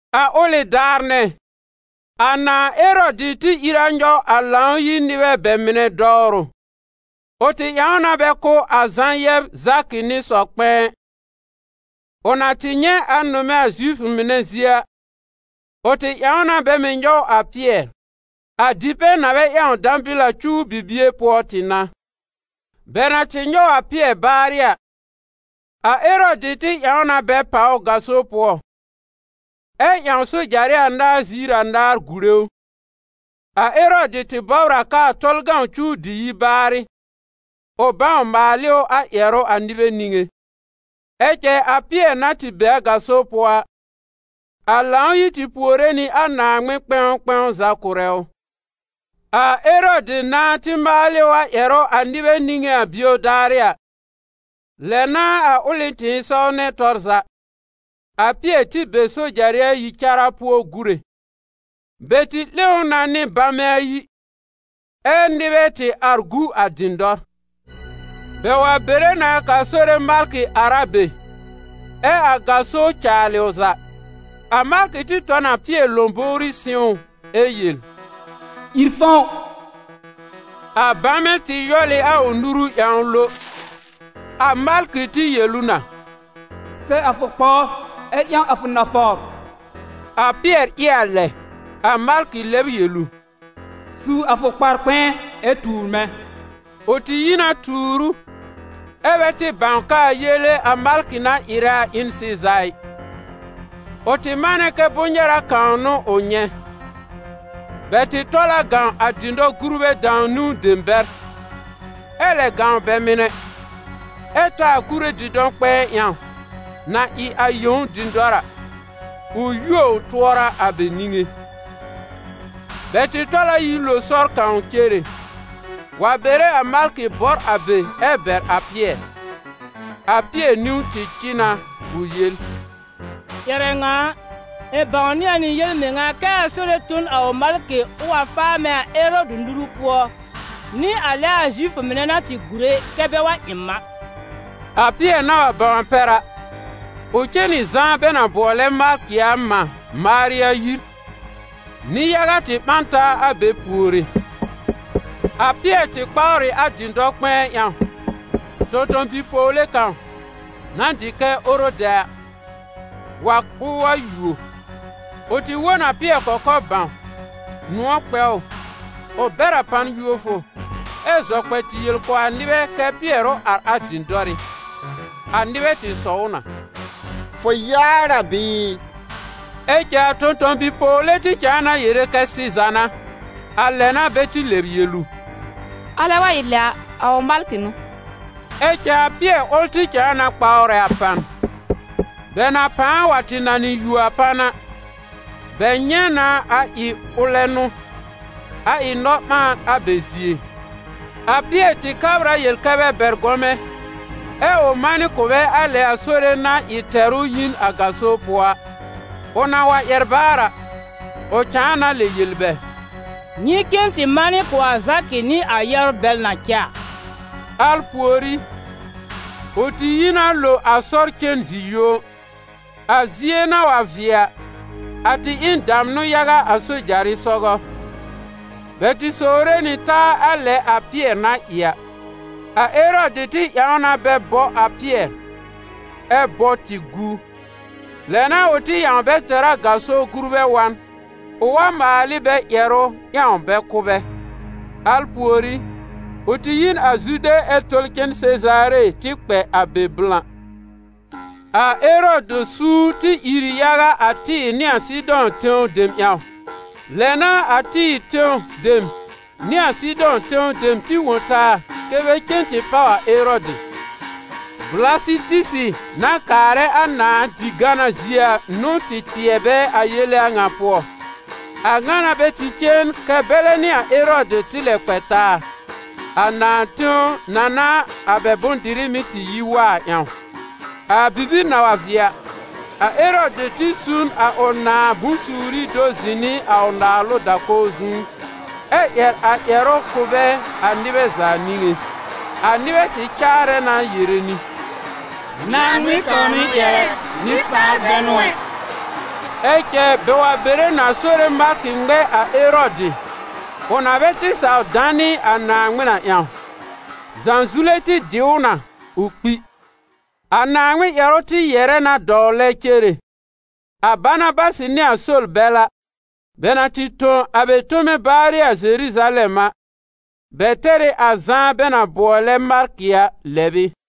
A ʋlɩ daar nɛ, a nãà Erɔdɩ tɩ ìr a nyɔw a Lãw-yir nɩbɛ bɛ mɩnɛ dɔwrʋ. Ʋ tɩ ƴãw na bɛ kʋ́ a Zã yɛb Zakɩ nɩ sɔ-kpɛ̃ɛ. Ʋ na tɩ nyɛ̃ a nʋmɛ a Zifʋ mɩnɛ zie a, ʋ tɩ ƴãw na bɛ mɩ̀ nyɔw a Pɩɛr. A dipɛ̃ na bɛ ƴãw dãbɩl a cuw bibie pʋɔ tɩ n'a. Bɛ na tɩ nyɔw a Pɩɛr baarɩ a, a Erɔdɩ tɩ ƴãw na bɛ pàw ʋ gaso pʋɔ, ɛ ƴãw sojarɩ anaar ziir anaar gùre ʋ. A Erɔdɩ tɩ bɔbr a k'aa Tɔlʋ cuw dɩ yi baarɩ, ʋ bãw maal ɩ ʋ a ƴɛrʋ a nɩbɛ niŋé. Ɛ cɛ a Pɩɛr na tɩ be a gaso pʋɔ a, a Lãw-yir tɩ puore nɩ a Naaŋmɩn kpɛ̃w kpɛ̃w za kʋ̀rɛ ʋ. A Erɔdɩ nãá tɩ maal ɩ ʋ a ƴɛrʋ a nɩbɛ niŋé a bio daarɩ a, lɛ n'a a ʋlɩ tɩ̃ɩsɔw nɛ tɔr za, a Pɩɛr tɩ be sojarɩ ayi cara pʋɔ gúre. Bɛ tɩ 'lẽ ʋ na nɩ bamɛ ayi, ɛ́ nɩbɛ tɩ ar gu a dɩ̃dɔr. Bɛ wa bere na k'a Sore malkɩ ar a be, ɛ a gaso caalɩ ʋ za. A malkɩ tɩ tɔ n a Pɩɛr lõbówrí sɩ̃w ʋ ɛ yel: «Ìr fɔ̃w!» A bamɛ tɩ yɔl ɩ a ʋ nuru ƴãw lo. A malkɩ tɩ yel ʋ na: «Sɛ a fʋ kpawr ɛ ƴãw a fʋ nafawr.» A Pɩɛr ɩ a lɛ. A malkɩ lɛb yel ʋ: «Su a fʋ kpar-kpɛ̃ɛ ɛ tuur mɛ̃.» Ʋ tɩ yi na tuur ʋ, ɛ́ bɛ tɩ bãw k'aa yele a malkɩ na ɩrɛ a ɩ n sɩza ɩ: ʋ tɩ manɛ kɛ bʋ̃-nyɛra kãw n'ʋ ʋ nyɛ̃. Bɛ tɩ tɔl a gãw a dɩ̃dɔ-gurbɛ dãw-niwn dem bɛr, ɛ lɛ gãw bɛ mɩnɛ, ɛ ta a kure dɩ̃dɔ-kpɛ̃ɛ ƴãw, na ɩ a yẽw dɩ̃dɔr a, ʋ yuo ʋ tʋɔra a bɛ niŋé. Bɛ tɩ tɔl a yi lo sɔr kãw cere, wa bere a malkɩ bɔr a be ɛ bɛr a Pɩɛr. A Pɩɛr niwn tɩ cɩ na ʋ yel: «Ƴɛrɛ ŋa a, ɩ̃ bãwnɩ a nɩ yel-mɩŋa kɛ a Sore tõ n a ʋ malkɩ ʋ wa faa mɛ̃ a Erɔdɩ nuru pʋɔ, nɩ a lɛ a Zifʋ mɩnɛ na tɩ gùre kɛ bɛ wa ɩ m a.» A Pɩɛr na wa bãw a pɛr a, ʋ cen nɩ Zã bɛ na bʋɔlɛ Markɩ a mã, Marya, yir. Nɩ-yaga tɩ ɓã n taa a be puore. A Pɩɛr tɩ kpawr ɩ a dɩ̃dɔ-kpɛ̃ɛ ƴãw, tõ-tõ-bi-pɔwle kãw, na dɩ kɛ Orodɛ a, wa k'ʋʋ wa yuo. Ʋ tɩ wõ n a Pɩɛr kɔkɔr bãw, nʋ̃ɔ̀ kpɛ ʋ, ʋ bɛr a pan yuofʋ, ɛ zɔ kpɛ tɩ yel kʋ̀ a nɩbɛ kɛ́ Pɩɛr ʋ ar a dɩ̃dɔrɩ́. A nɩbɛ tɩ sɔw ʋ na: «Fʋ yaar a bɩɩ?» Ɛ cɛ a tõ-tõ-bi-pɔwle tɩ cãa na yere kɛ sɩza n'a. A lɛ n'a bɛ tɩ lɛb yel ʋ: «Alɛ wa ɩ lɛ a, a ʋ malkɩ n'ʋ!» Ɛ cɛ a Pɩɛr ʋl tɩ cãa na kpawrɛ a pan. Bɛ na pãa wa tɩ nanɩ yuo a pan a, bɛ nyɛ̃ na a ɩ ʋlɛ n'ʋ, a ɩ nɔ-ɓãan a bɛ zie. A Pɩɛr tɩ kabr a yel kɛ́ bɛ bɛr gɔmɛ, ɛ ʋ manɩ kʋ̀ bɛ a lɛ a Sore na ɩ tɛr ʋ yi n a gaso pʋɔ a. Ʋ na wa ƴɛr baar a, ʋ cãa na lɛ yel bɛ: «Nyɩ cen tɩ manɩ kʋ̀ a Zakɩ nɩ a yɛbr bɛl na cɛ a.» Al pùorí, ʋ tɩ yi na lo a sɔr cen zi-yũo. A zie na wa vɩɛ a, a tɩ ɩ n damnʋ yaga a sojarɩ sɔgɔ: bɛ tɩ sowre nɩ taa a lɛ a Pɩɛr na ɩ a. A Erɔdɩ tɩ ƴãw na bɛ bɔ a Pɩɛr, ɛ́ bɔ tɩ gu. Lɛ n'a ʋ tɩ ƴãw bɛ tɛr a gaso gurbɛ wa n, ʋ wa maal ɩ bɛ ƴɛrʋ ƴãw bɛ kʋ́ bɛ. Al pùorí, ʋ tɩ yi n a Zude ɛ tɔl cen Sezaare tɩ kpɛ a be blã. A Erɔdɩ suur tɩ ìr ɩ yaga a Tɩ́ɩ̀r nɩ a Sɩdɔ̃ tẽw dem ƴãw. Lɛ n'a a Tɩ́ɩ̀r tẽw dem nɩ a Sɩdɔ̃ tẽw dem tɩ wõ taa kɛ́ bɛ cen tɩ páw a Erɔdɩ. Blasɩtisɩ na kaarɛ a nãà di-gana zie a n'ʋ tɩ tɩɛ bɛ a yele a ŋa pʋɔ. A ŋa n'a bɛ tɩ cen kɛ́ bɛlɛ nɩ a Erɔdɩ tɩ lɛ kpɛ taa, a nãà tẽw na n'a a bɛ bʋ̃-dɩrɩ mɩ́ yi wa a ƴãw. A bibir na wa vɩɛ a, a Erɔdɩ tɩ su n a ʋ nãà bʋ̃-suuri do zɩ̃ nɩ a ʋ naalʋ da-kɔw zu, ɛ ƴɛr a ʋ ƴɛrʋ kʋ̀ bɛ a nɩbɛ za niŋé. A nɩbɛ tɩ caarɛ na yere nɩ: «Naaŋmɩn kãw n'ʋ ƴɛrɛ, nɩsaal bɛ n'ʋ ɛ!» Ɛ cɛ bɛ wa bere na Sore malkɩ ŋmɛ a Erɔdɩ, ʋ na bɛ tɩ saw danɩ a Naaŋmɩn a ƴãw: zãzule tɩ dɩ ʋ na, ʋ kpi. A Naaŋmɩn ƴɛrʋ tɩ yɛ̀rɛ na dɔwlɛ cere. A Banabasɩ nɩ a Sol bɛl a, bɛ na tɩ tõ a bɛ tome baarɩ a Zeruzalɛm a, bɛ tɛr ɩ a Zã bɛ na bʋɔlɛ Markɩ a lɛb ɩ.